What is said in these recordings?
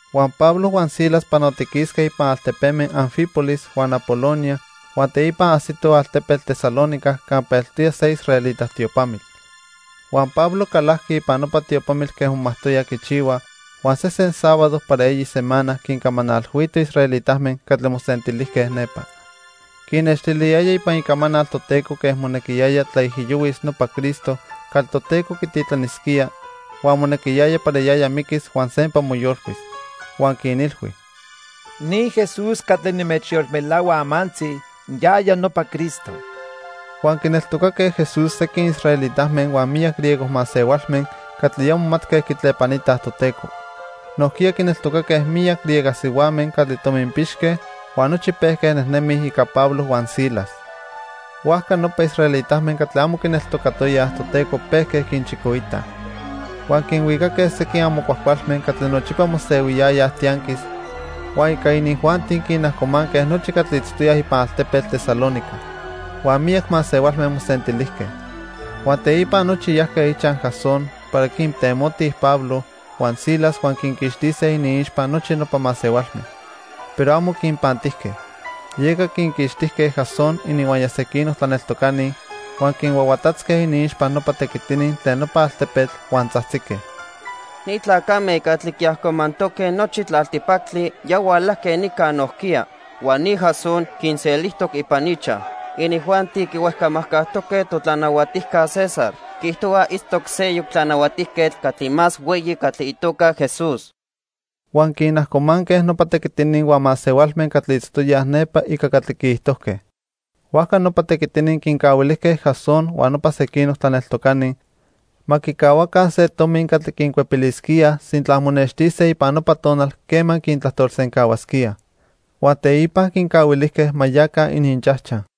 Huan Pablo huan Silas panotiquisque ipan altepeme Anfípolis huan Apolonia huan teipa ajsitoj altepetl Tesalónica campa eltoya se israelita tiopamitl. Huan Pablo calajqui ipan nopa tiopamitl quen momajtoya quichihua, huan sesen sábado para eyi semana quincamanalhuito israelitame catli mosentilijque nepa. Quinnextiliyaya ipan Icamanal Toteco quen monequiyaya tlaijiyohuis nopa Cristo catli Toteco quititlanisquía huan monequiyaya para yaya miquis huan sempa moyolcuis. Huan quinilhui: —Ni Jesús catli nimechyolmelahua amantzi, yaya nopa Cristo. Huan quineltocaque Jesús sequin israelitame huan miyac griego masehualme catli ya momatque quitlepanitaj Toteco. Nojquiya quineltocaque miyac griega sihuame catli tominpixque huan nochi pejque nejnemij ica Pablo huan Silas. Huajca nopa israelitame catli amo quineltocatoyaj Toteco pejque quinchicoitaj. Huan quinhuicaque sequin amo cuajcualme catli nochipa mosehuiyayaj tianquis, huan ica inijuanti quinajcomanque nochi catli itztoyaj ipan altepetl Tesalónica. Huan miyac masehualme mosentilijque. Huan teipa nochi yajque ichaj Jasón para quintemotij Pablo huan Silas huan quinquixtise iniixpa nochi nopa masehualme. Pero amo quinpantijque. Yeca quinquixtijque Jasón ininhuaya sequinoc tlaneltocani, huan quinhuahuatatzque iniixpa nopa tequitini tlen nopa altepetl, huan tzajtzique: —Ni tlacame catli quiajcomantoque nochi tlaltipactli ya hualajque nica nojquiya. Huan ni Jasón quinselijtoc ipan ichaj. Inijuanti quihuejcamajcajtoque totlanahuatijca César. Quiijtohuaj itztoc seyoc tlanahuatijquetl catli más hueyi catli itoca Jesús. Huan quinajcomanque nopa tequitini huan masehualme catli itztoyaj nepa ica catli quiijtojque. Huajca nopa tequitini quincahuilijque Jasón huan nopa sequinoc tlaneltocani ma quicahuaca se tomi catli quincuepilisquíaj sintla monextise ipan nopa tonal quema quintlajtolsencahuasquíaj. Huan teipa quincahuilijque ma yaca ininchajchaj.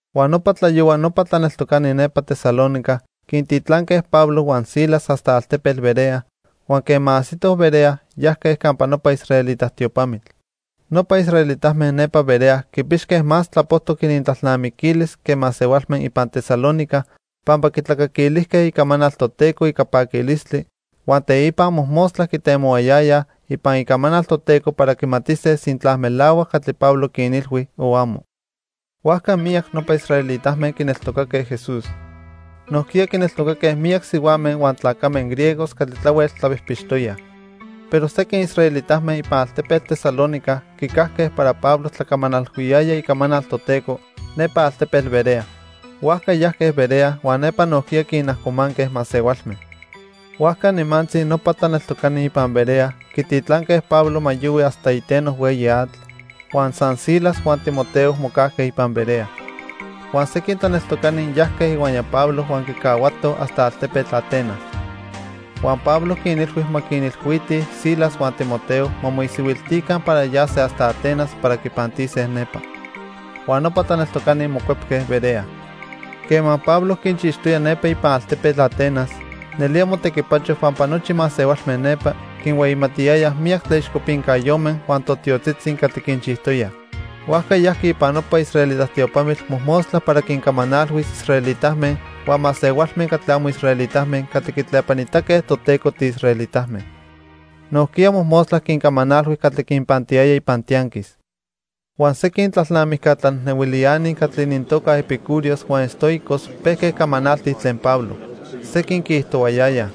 Huan nopa tlayohua nopa tlaneltocani nepa Tesalónica quintitlanque Pablo huan Silas hasta altepetl Berea, huan quema ajsitoj Berea, yajque campa nopa israelita tiopamitl. Nopa israelitame nepa Berea quipixque más tlapojtoc inintlalnamiquilis que masehualme ipan Tesalónica, pampa quitlacaquilijque icamanal Toteco ica paquilistli huan teipa mojmostla quitemohuayayaj ipan Icamanal Toteco para quimatise sintla melahuac catli Pablo quinilhui o amo. Huajca miyac nopa israelitame quineltocaque Jesús. Nojquiya quineltocaque miyac sihuame huan tlacame griegos catli tlahuel tlapijpixtoyaj. Pero sequin israelitame ipan altepetl Tesalónica quicajque para Pablo tlacamanalhuiyaya icamanal Toteco nepa altepetl Berea. Huajca yajque Berea huan nepa nojquiya quinajcomanque masehualme. Huajca nimantzi nopa tlaneltocani ipan Berea quititlanque Pablo ma yohui hasta iteno hueyi atl, huan san Silas huan Timoteo mocajque ipan Berea. Huan sequin tlaneltocani yajque ihuaya Pablo huan quicahuatoj hasta altepetl Atenas. Huan Pablo quinilhui ma quinilhuitij Silas huan Timoteo ma moisihuiltica para yase hasta Atenas para quipantise nepa. Huan nopa tlaneltocani mocuepque Berea. Quema Pablo quinchixtoya nepa ipan altepetl Atenas, nelía motequipacho pampa nochi masehualme nepa quinhueyimatiyayaj miyac tlaixcopincayome huan totiotzitzi catli quinchijtoyaj. Huajca yajqui ipan nopa israelita tiopamitl mojmostla para quincamanalhuis israelitame huan masehualme catli amo israelitame catli quitlepanitaque Toteco tiisraelitame. Nojquiya mojmostla quincamanalhui catli quinpantiyaya ipan tianquis. Huan sequin tlalnamijca tlanejnehuiliani catli inintoca epicúreos huan estoicos pejque camanaltij tlen Pablo. Sequin quiijtohuayayaj: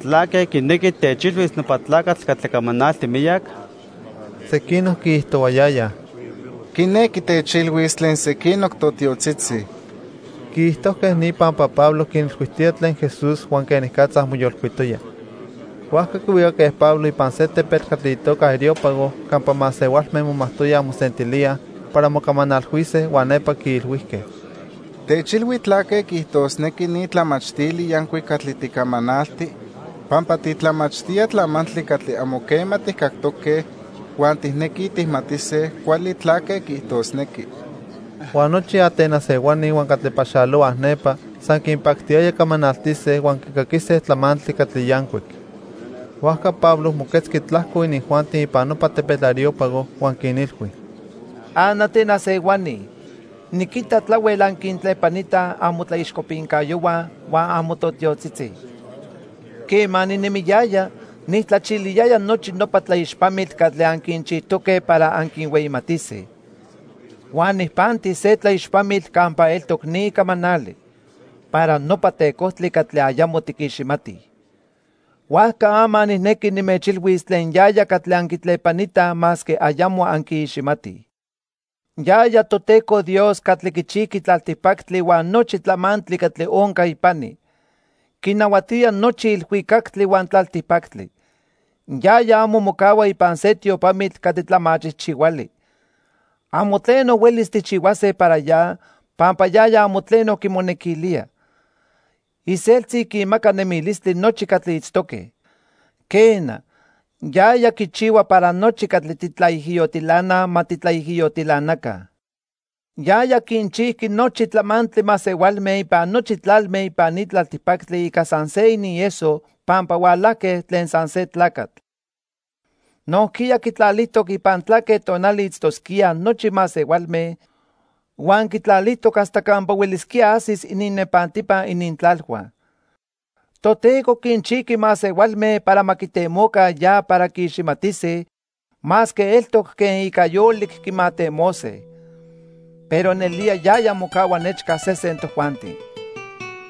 —¿Tlaque quinequi techilhuis nopa tlacatl catli camanalti miyac? Sequinoc quiijtohuayayaj: —Quinequi techilhuis tlen sequinoc totiotzitzi. Quiijtojque ni pampa Pablo quinilhuijtoya tlen Jesús huan quenicatza moyolcuitoya. Huajca quihuicaque Pablo ipan se tepetl catli itoca Areópago campa masehualme momajtoyaj mosentilíaj para mocamanalhuise huan nepa quiilhuijque: —Techilhui tlaque quiijtosnequi ni tlamachtili yancuic catli ticamanalti, pampa titlamachtía tlamantli catli amo quema tijcactoque huan tijnequij tijmatise cuali tlaque quiijtosnequi. Huan nochi Atenas ehuani huan catli paxalohuaj nepa san quinpactiyaya camanaltise huan quicaquise tlamantli catli yancuic. Huajca Pablo moquetzqui tlajco inijuanti ipan nopa tepetl Areópago huan quinilhui: "AnAtenas ehuani, niquita tlahuel anquintlepanitaj amotlaixcopincayohua huan amototiotzitzi. Quema ninemiyaya, nijtlachiliyaya nochi nopa tlaixpamitl catli anquinchijtoque para anquinhueyimatise. Huan nijpanti se tlaixpamitl campa eltoc ni camanali: 'Para nopa tecojtli catli ayamo tiquiximatij.' Huajca ama nijnequi nimechilhuis tlen yaya catli anquitlepanitaj masque ayamo anquiiximatij. "Yaya Toteco Dios catli quichijqui tlaltipactli huan nochi tlamantli catli onca ipani. Quinahuatía nochi ilhuicactli huan tlaltipactli. Yaya amo mocahua ipan se tiopamitl catli tlamachijchihuali. Amo tleno huelis tijchihuase para ya, pampa yaya amo tleno quimonequilía. Iseltzi quinmaca nemilistli nochi catli itztoque. Quena, yaya quichihua para nochi catli titlaijiyotilanaj ma titlaijiyotilanaca. "Yaya quinchijqui nochi tlamantli masehualme ipan nochi tlalme ipan ni tlaltipactli ica san se inieso pampa hualajque tlen san se tlacatl. Nojquiya quitlalijtoc ipan tlaque tonali itztosquíaj nochi masehualme, huan quitlalijtoc hasta campa huelisquía ajsis ininnepantipa inintlalhua. Toteco quinchijqui masehualme para ma quitemoca ya para quiiximatise, masque eltoc quen ica yolic quimatemose. Pero nelía yaya mocahua nechca sesen tojuanti.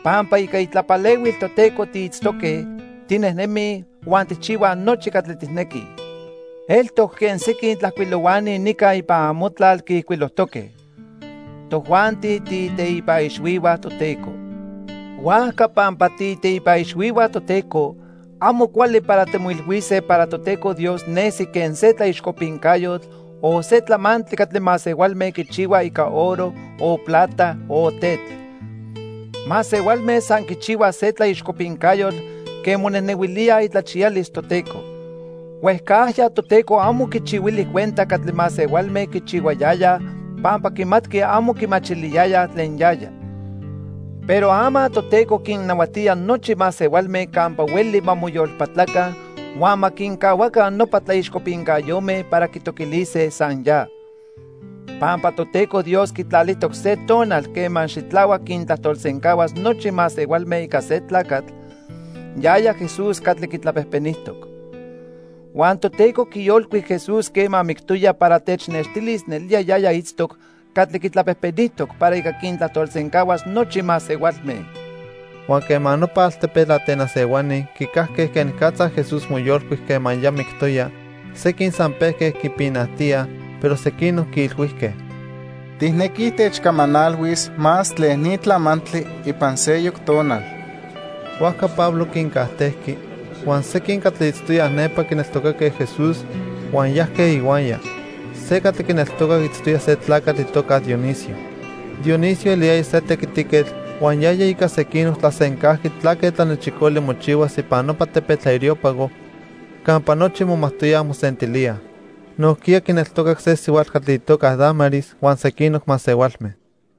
Pampa ica itlapalehuil Toteco tiitztoque, tinejnemij huan tijchihuaj nochi catli tijnequij. Eltoc quen sequin tlajcuilohuani nica ipan amotlal quiijcuilojtoque: 'Tojuanti tiiteipa ixhuihua Toteco.' Huajca pampa tiiteipa ixhuihua Toteco, amo cuali para timoilhuise para Toteco Dios nesi quen se tlaixcopincayotl o se tlamantli catli masehualme quichihuaj ica oro, o plata o tetl. Masehualme san quichihuaj se tlaixcopincayotl quen monejnehuilíaj itlachiyalis Toteco. Huejcajya Toteco amo quichihuili cuenta catli masehualme quichihuayayaj pampa quimatqui amo quimachiliyayaj tlen yaya. Pero ama Toteco quinnahuatía nochi masehualme campa hueli ma moyolpatlaca huan ma quincahuaca nopa tlaixcopincayome para quitoquilise san ya. Pampa Toteco Dios quitlalijtoc se tonal quema xitlahuac quintlajtolsencahuas nochi masehualme ica se tlacatl, yaya Jesús catli quitlapejpenijtoc. Huan Toteco quiyolcuic Jesús quema mictoya para technextilis nelía yaya itztoc catli quitlapejpenijtoc para ica quintlajtolsencahuas nochi masehualme." Huan quema nopa altepetl Atenas ehuani quicajque quenicatza Jesús moyolcuic quema ya mictoya, sequin san pejque quipinajtíaj, pero sequinoc quiilhuijque: —Tijnequij techcamanalhuis más tlen ni tlamantli ipan seyoc tonal. Huajca Pablo quincajtejqui. Huan sequin catli itztoyaj nepa quineltocaque Jesús, huan yajque ihuaya. Se catli quineltocac itztoya se tlacatl itoca Dionisio. Dionisio eliyaya se tequitiquetl huan yaya ica sequinoc tlasencajqui tlaque tlanechicoli mochihuas ipan nopa tepetl Areópago campa nochi momajtoyaj mosentilíaj. Nojquiya quineltocac se sihuatl catli itoca Dámaris huan sequinoc masehualme.